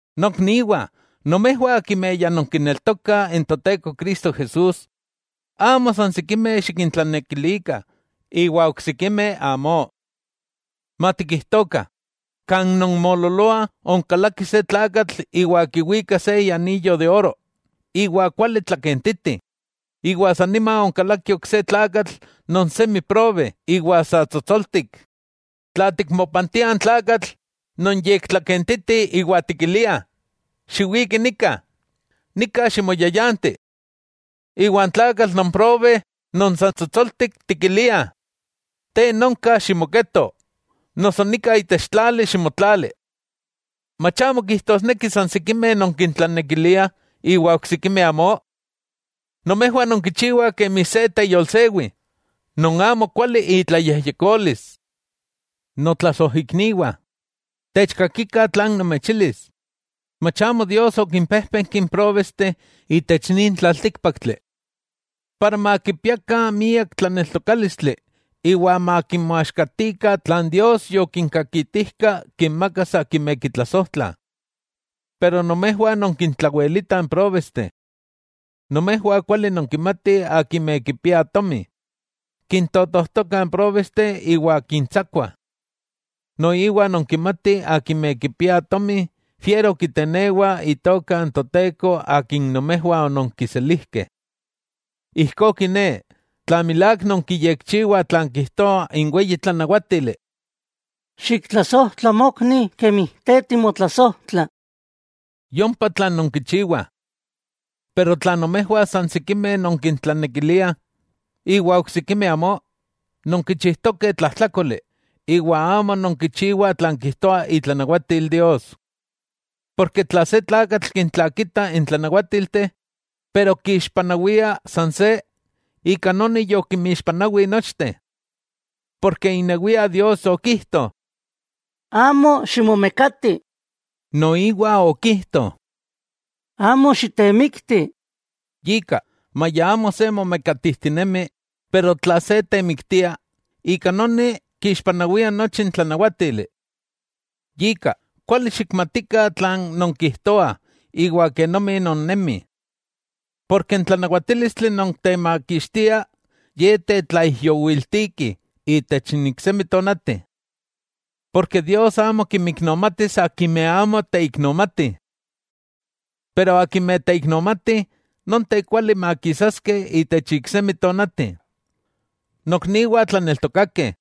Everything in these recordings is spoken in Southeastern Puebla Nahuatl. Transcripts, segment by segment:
Nokniwah, nomejwah akimeh ya nonkineltokah n Toteko Cristo Jesús, amo san sikimeh xikintlanekilikah iwa oksikimeh amó. Matikijtokah, kan nonmoololoah onkalaki se tlakatl iwa kiwika se ianiyo de oro iwa kuali tlakentiti, iwa san nima onkalaki ok se tlakatl non semi probe iwa sa tsotsoltik, tla tikmopantia n tlakatl non yektlakentiti iwa tikilia: “Xiwiki nika, nika ximoyayanti.” Iwa n tlakatl non probe non sa tsotsoltik, tikilia: “Te nonka ximoketo, noso nika itech tlali ximotlali.” ¿Mach amo kijtosneki san sikimeh nonkintlanekiliah iwa oksikimeh amó? Nomejwah nonkichiwah kemi se teyolsewi, non amo kuali itlayejyekolis. Notlasojikniwah, techkakikah tlan nomechilis: Mach amo Dios okimpéjpenki n próbesteh itech nin tlaltíkpaktli, para makipiakah miak tlaneltokálistli iwa makimoaxkatikah tlan Dios yokinkakitijka kinmakas akimeh kitlasojtlah. ¡Pero nomejwah nonkintlawelitah n próbesteh! Nomejwah kuali nonkimatih akimeh kipiah tomi, kintotojtokah n próbesteh iwa kintsakua. Noiwa nonkimatih akimeh kipiah tomi, fiero kitenewa itoka n Toteko akin nomejwah ononkiselijkeh. Ijkó kiné, tla milák nonkiyekchiwah tlan kijtoa n weyi tlanawátili: “Xiktlasojtla mokni kemi te timotlasojtla”, yompa tlan nonkichiwah. Pero tla nomejwah san sikimeh nonkintlanekiliah iwa oksikimeh amó, nonkichijtokeh tlajtlákoli, iwa amo nonkichiwah tlan kijtoa itlanawatil Dios. Tla se tlakatl kintlakita n tlanawátilteh, pero kixpanawia san se, ika noni yokinmixpanawi nochteh. Porke inewia Dios okijto: “Amo ximomekati”, noiwa okijto: “Amo xitemikti.” Yika maya amo se momekatijtinemi, pero tla se temiktia, ika noni kixpanawia nochi n tlanawátili. Yika, kuali xikmatikah tlan nonkijtoah iwa kenomi nonnemih. N tlanawatílistli non temakixtia ye tetlaijyowiltiki itech n iksemi tonati. Dios amo kinmiknomatis akimeh amo teiknomatih. Pero akimeh teiknomatih, nonteh kuali makisaskeh itech iksemi tonati. Nokniwah tlaneltokakeh,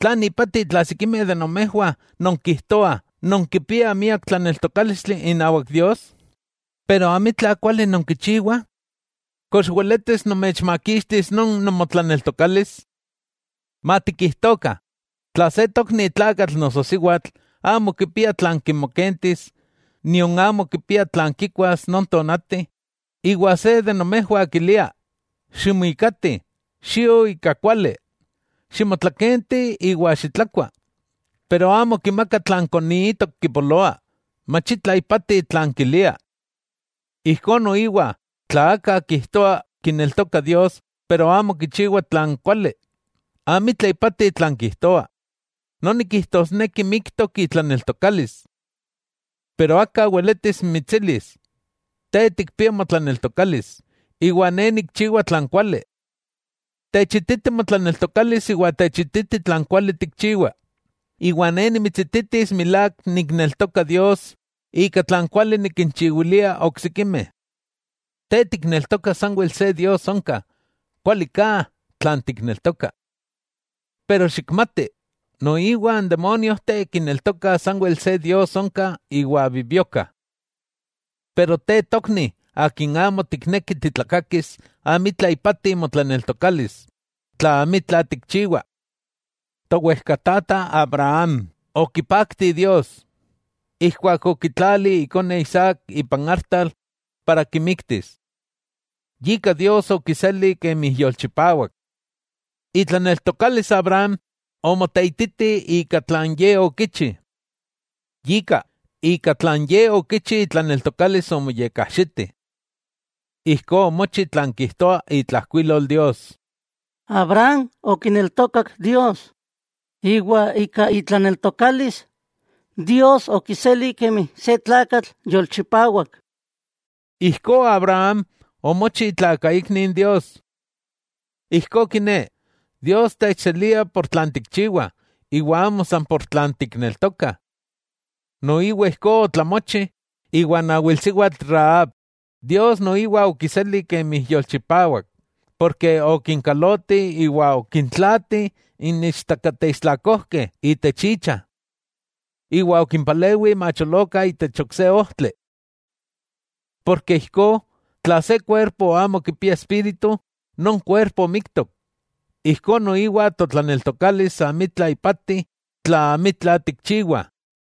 ¿tlan ipati tla sikimeh de nomejwah nonkijtoah nonkipiah miak tlaneltokálistli inawak Dios, pero amitla kuali nonkichiwah?, ¿kox weletis nomechmakixtis non nomotlaneltokalis? Matikijtokah, tla se tokni tlakatl noso siwatl, amo kipia tlan kimokentis nion amo kipia tlan kikuas non tonati, iwa se de nomejwah kilia: “Ximuikati, xio ika kuali, ximotlakenti iwa xitlakua”, pero amo kimaka tlan koniitok kipoloa, ¡mach itla ipati tlan kilia! Ijkó noiwa tla aka kijtoa kineltoka Dios pero amo kichiwa tlan kuali, amitla ipati tlan kijtoa, noni kijtosneki miktok itlaneltokalis. Pero aka weletis mitsilis: “Te tikpia motlaneltokalis, iwa ne nikchiwa tlan kuali.” Techititi motlaneltokalis iwa techititi tlan kuali tikchiwa, iwa ne nimitsititis milák nikneltoka Dios ika tlan kuali nikinchiwilia oksikimeh. Te tikneltoka sanwel se Dios onka, kualiká tlan tikneltoka. Pero xikmati, noiwa n demóniojteh kineltokah sanwel se Dios onka iwa bibiokah. Pero te tokni akin amo tikneki titlakakis, amitla ipati motlaneltokalis tla amitla tikchiwa. Towejkatata Abraham okipakti Dios, ijkuak okitlali ikone Isaac ipan artal para kimiktis. Yika Dios okiseli kemi yolchipawak. Itlaneltokalis Abraham omoteititi ika tlan ye okichi. Yika, ika tlan ye okichi itlaneltokalis omoyekajxiti. Ijkó omochi tlan kijtoa itlajkuilol Dios: “Abraham okineltokak Dios, iwa ika itlaneltokalis Dios okiseli kemi se tlakatl yolchipawak.” Ijkó Abraham omochi itlakaikni n Dios. Ijkó kiné, Dios techselia ika tlan tikchiwa, iwa amo ika tlan tikneltokah. Noiwa ijkó otlamochi iwan awilsiwatl Rahab, Dios noiwa okiseli kemi yolchipawak ken okinkaloti iwa okintlaati n ichtakateistlakojkeh itech icha, iwa okimpalewi macholokah itech ok se ojtli. Yika, tla se kuerpo amo kipia espíritu, non kuerpo miktok, ijkó noiwa totlaneltokalis amitla ipati tla amitla tikchiwah.